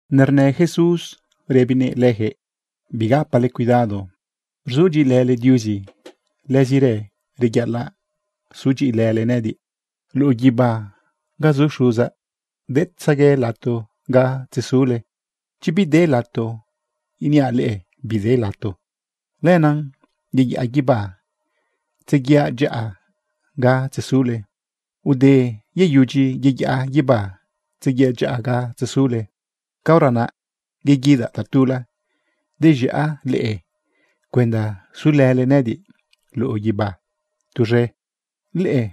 Nernë Jesús rëbinëꞌ leyaquëꞌ: ―Bigapale cuidado. Rzudyiꞌilële Diuzi, lëzirë reyaꞌalaꞌ sudyiꞌilële nëꞌëdiꞌ. Luꞌu guibá ga zu Xuzaꞌ, detzegue lato ga tzezule. Chi bide lato, iniaꞌ leꞌe bide lato. Lenaꞌ yeyaꞌa guibá tzeguiaꞌ dyaꞌa ga tzezule. Ude yeyudyi yeyaꞌa guibá tzeguiaꞌ dyaꞌa ga tzezule, caora naꞌ yeguidaꞌ tatula dez̃iaꞌ leꞌe cuenda sulële nëꞌëdiꞌ luꞌu guibá tuz̃e. Leꞌe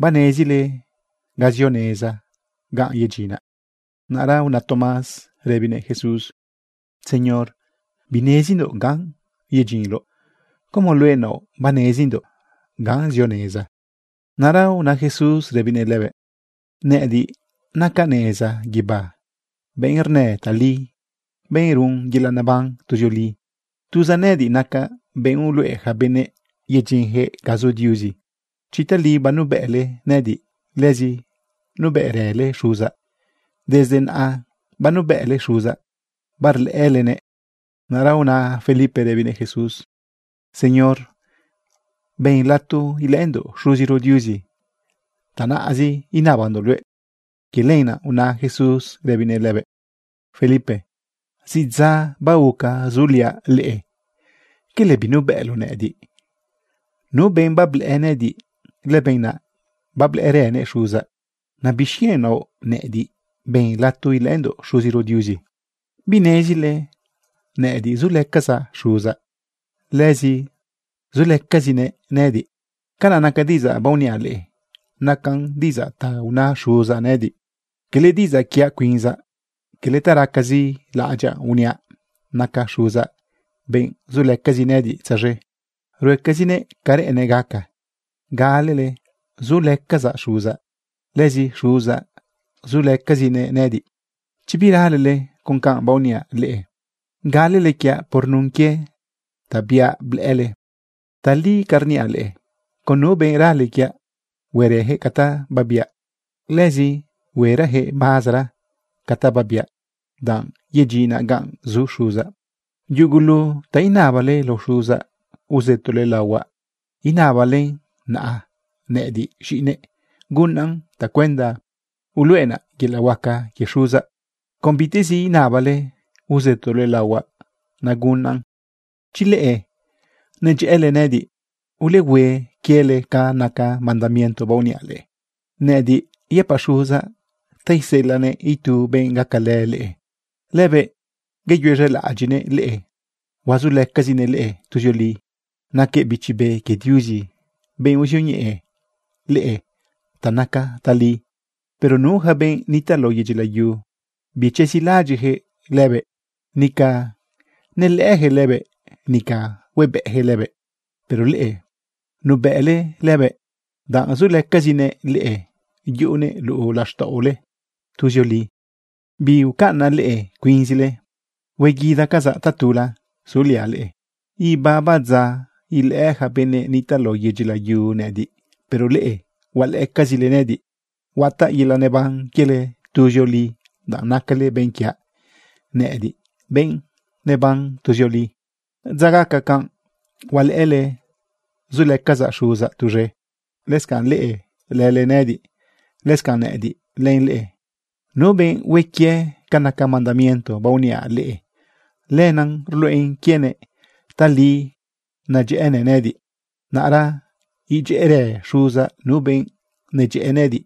banezile ga zio neza ganꞌ yedyinaꞌ. Naꞌra una Tomás rëbinëꞌ Jesús: ―Señor, binezindoꞌ ganꞌ yedyinloꞌ, ¿cómo luëꞌ naoꞌ banezindoꞌ ganꞌ zio neza? Naꞌra una Jesús rëbinëꞌ lëbëꞌ: ―Nëꞌëdiꞌ nacaꞌ neza guibá, benꞌ rnë tali, benꞌ run yelaꞌ neban tuzioli. Tuzaꞌ nëꞌëdiꞌ nacaꞌ benꞌ uluꞌe yaca benëꞌ yedyinyaquëꞌ ga zu Diuzi. Chi tali banubëꞌle nëꞌëdiꞌ, lëzi nubëꞌrële Xuzaꞌ. Desde naꞌa banubëꞌle Xuzaꞌ, barlëꞌëlenëꞌ. Naꞌra una Felipe rëbinëꞌ Jesús: ―Señor, ben lato ilëꞌëndoꞌ Xuziro Diuzi. Tanaꞌzi inabandoꞌ luëꞌ. Quie lenaꞌ una Jesús rëbinëꞌ lëbëꞌ: ―Felipe, zidza baoca zuliaꞌ leꞌe, ¿quele binubëꞌloꞌ nëꞌëdiꞌ? Nu benꞌ bablëꞌë nëꞌëdiꞌ, lëbenꞌ naꞌ bablëꞌërënëꞌ Xuzaꞌ. ¿Naꞌ bixquienꞌ naoꞌ nëꞌëdiꞌ: “Ben lato ilëꞌëndoꞌ Xuziro Diuzi”? ¿Binezile nëꞌëdiꞌ zulëcazaꞌ Xuzaꞌ, lëzi zulëcazinëꞌ nëꞌëdiꞌ? Ca naca diꞌidzaꞌ baoniaꞌ leꞌe nacan diꞌidzaꞌ ta una Xuzaꞌ nëꞌëdiꞌ, cala diꞌidzaꞌ quiaꞌ cuinzaꞌ. Cala ta racazi laꞌadyaꞌ uniaꞌ. Naca Xuzaꞌ benꞌ zulëcazi nëꞌëdiꞌ tzaz̃e. Ruecazinëꞌ ca reꞌennëꞌ gaca. Galele zulëcazaꞌ Xuzaꞌ, lëzi Xuzaꞌ zulëcazinëꞌ nëꞌëdiꞌ. Chi biralele con canꞌ baoniaꞌ leꞌe, galele quiaꞌ por nun quie ta biaꞌ blëꞌële. Tali ca rniaꞌ leꞌe, con nu benꞌ rale quiaꞌ, huerëyaquëꞌ ca ta babiaꞌ. Lëzi huerayaquëꞌ mazara ca ta babiaꞌ, danꞌ yedyinaꞌ ganꞌ zu Xuzaꞌ. Yugulu ta inabale lao Xuzaꞌ, uzëtole laohuaꞌ inabalen, naꞌ nëꞌëdiꞌ z̃iꞌinëꞌ, gunaꞌn tacuenda uluꞌenaꞌ yelaꞌ huaca quie Xuzaꞌ. Con bitezi inabale uzëtole laohuaꞌ, nagunaꞌn. ’Chi leꞌe nedyëꞌële nëꞌëdiꞌ, ulehue quiele ca naca mandamiento baoniaꞌ leꞌe. Nëꞌëdiꞌ yëpaꞌ Xuzaꞌ ta iseꞌelaꞌnëꞌ itu benꞌ gacalë leꞌe. Lëbëꞌ yeyuez̃elaꞌadyiꞌnëꞌ leꞌe, huazulëcazinëꞌ leꞌe tuzioli. Naquëꞌ Bichi Be quie Diuzi, benꞌ uzioñeꞌe leꞌe ta naca tali. Pero nu yaca benꞌ nitaꞌ lao yedyi layu, bichezilaꞌadyiꞌyaquëꞌ lëbëꞌ, nica nelëꞌëyaquëꞌ lëbëꞌ, nica huebëꞌyaquëꞌ lëbëꞌ. Pero leꞌe nubëꞌle lëbëꞌ, danꞌ zulëcazinëꞌ leꞌe yuꞌunëꞌ luꞌu laxtaꞌole tuzioli. Biucaꞌnaꞌ leꞌe cuinzile. Hueguidacazaꞌ tatula suliaꞌ leꞌe. Ibaba dza ilëꞌë yaca benëꞌ nitaꞌ lao yedyi layu nëꞌëdiꞌ. Pero leꞌe, hualëꞌëcazile nëꞌëdiꞌ. Huataꞌ yelaꞌ neban quiele tuzioli, danꞌ nacale benꞌ quiaꞌ nëꞌëdiꞌ, benꞌ neban tuzioli. Dza gaca canꞌ hualëꞌële zulëcazaꞌ Xuzaꞌ tuz̃e, lëscanꞌ leꞌe lëlënëꞌëdiꞌ, lëscanꞌ nëꞌëdiꞌ len leꞌe. Nu benꞌ hue quie ca naca mandamiento baoniaꞌ leꞌe, lenaꞌ rluꞌen quienëꞌ tali nedyëꞌënëꞌ nëꞌëdiꞌ. Naꞌra idyëꞌërë Xuzaꞌ nu benꞌ nedyëꞌë nëꞌëdiꞌ.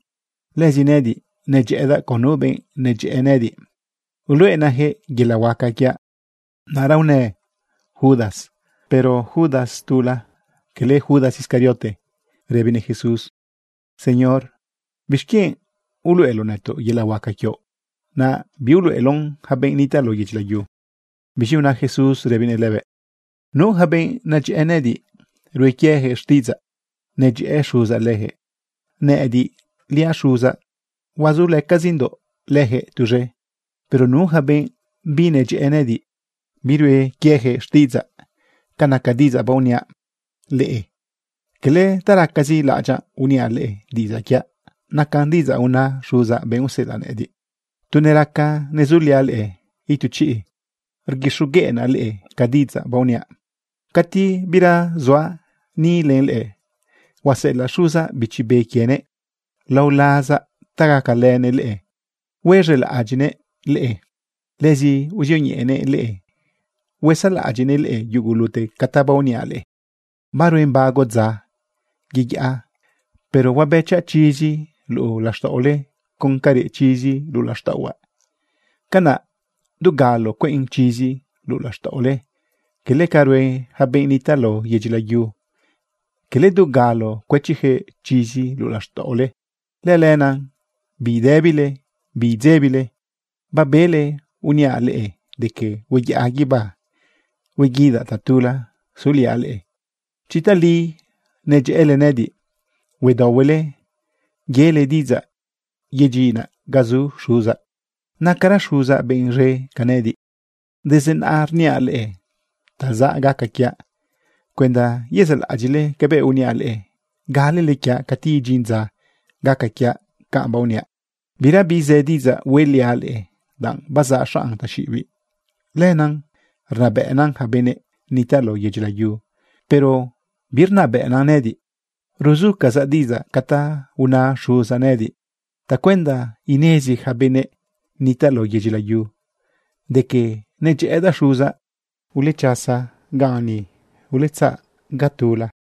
Lëzi nëꞌëdiꞌ nedyëꞌëdaꞌ con nu benꞌ nedyëꞌë nëꞌëdiꞌ, uluꞌenaꞌyaquëꞌ yelaꞌ huaca quiaꞌ. Naꞌra unë Judas, pero Judas tula, cala Judas Iscariote, rëbinëꞌ Jesús: ―Señor, ¿bixquienꞌ uluꞌeloꞌ nëtoꞌ yelaꞌ huaca quioꞌ, naꞌ biuluꞌeloꞌn yaca benꞌ nitaꞌ lao yedyi layu? Biz̃i una Jesús rëbinëꞌ lëbëꞌ: ―Nu yaca benꞌ nedyëꞌë nëꞌëdiꞌ, rue quieyaquëꞌ xtiꞌidzaꞌ, nadyëꞌë Xuzaꞌ leyaquëꞌ. Nëꞌëdiliaꞌ Xuzaꞌ huazulëcazindoꞌ leyaquëꞌ tuz̃e. Pero nu yaca benꞌ binedyëꞌë nëꞌëdiꞌ, birue quieyaquëꞌ xtiꞌidzaꞌ. Ca naca diꞌidzaꞌ baoniaꞌ leꞌe, cala ta racazi laꞌadyaꞌ uniaꞌ leꞌe, diꞌidzaꞌ quiaꞌ nacan diꞌidzaꞌ una Xuzaꞌ, benꞌ useꞌelaꞌ nëꞌëdiꞌ. ’Tu neraca nezuliaꞌ leꞌe itu chiꞌ, rguixogueꞌnaꞌ leꞌe ca diꞌidzaꞌ baoniaꞌ. Cati bira zuaꞌ ni len leꞌe, huaseꞌelaꞌ Xuzaꞌ Bichi Be quienëꞌ lao lazaꞌ ta gacalënëꞌ leꞌe huaz̃elaꞌadyiꞌnëꞌ leꞌe. Lëzi uzioñeꞌenëꞌ leꞌe usaꞌlaꞌadyiꞌnëꞌ leꞌe yugulute ca ta baoniaꞌ leꞌe. ’Baruen bago dza yeyaꞌa pero huabëchaꞌ chizi luꞌu laxtaꞌole con ca reꞌ chizi luꞌu laxtaꞌohuaꞌ. Canaꞌ dugalo cueꞌn chizi luꞌu laxtaꞌole, quele ca rue yaca benꞌ nitaꞌ lao yedyi layu, quele dugalo cuëchijëꞌ chizi luꞌu laxtaꞌole. Lëlenaꞌ bidëbile, bidzebile. Babele uniaꞌ leꞌe de que hueyaꞌa guibá hueguidaꞌ tatula suliaꞌ leꞌe. Chi tali nedyëꞌële nëꞌëdiꞌ, huedaohuele yele diꞌidzaꞌ yedyinaꞌ ga zu Xuzaꞌ. Nacara Xuzaꞌ benꞌ z̃e ca nëꞌëdiꞌ. Desde naꞌa rniaꞌ leꞌe ta zaꞌ gaca quiaꞌ cuenda yezaꞌlaꞌadyiꞌle cabëꞌ uniaꞌ leꞌe galele quiaꞌ cati idyin dza gaca quiaꞌ canꞌ baoniaꞌ. ’Birabi zë diꞌidzaꞌ hueꞌliaꞌ leꞌe, danꞌ bazaꞌ xanꞌ taxiꞌibiꞌ. Lëna rnabëꞌna yaca benëꞌ nitaꞌ lao yedyi layu. Pero birnabëꞌna nëꞌëdiꞌ. Ruzucazaꞌ diꞌidzaꞌ ca ta una Xuzaꞌ nëꞌëdiꞌ tacuenda inezi yaca benëꞌ nitaꞌ lao yedyi layu de que nedyëꞌëdaꞌ Xuzaꞌ. Ulechasa ganꞌ ni. Uletzaꞌ ga tula.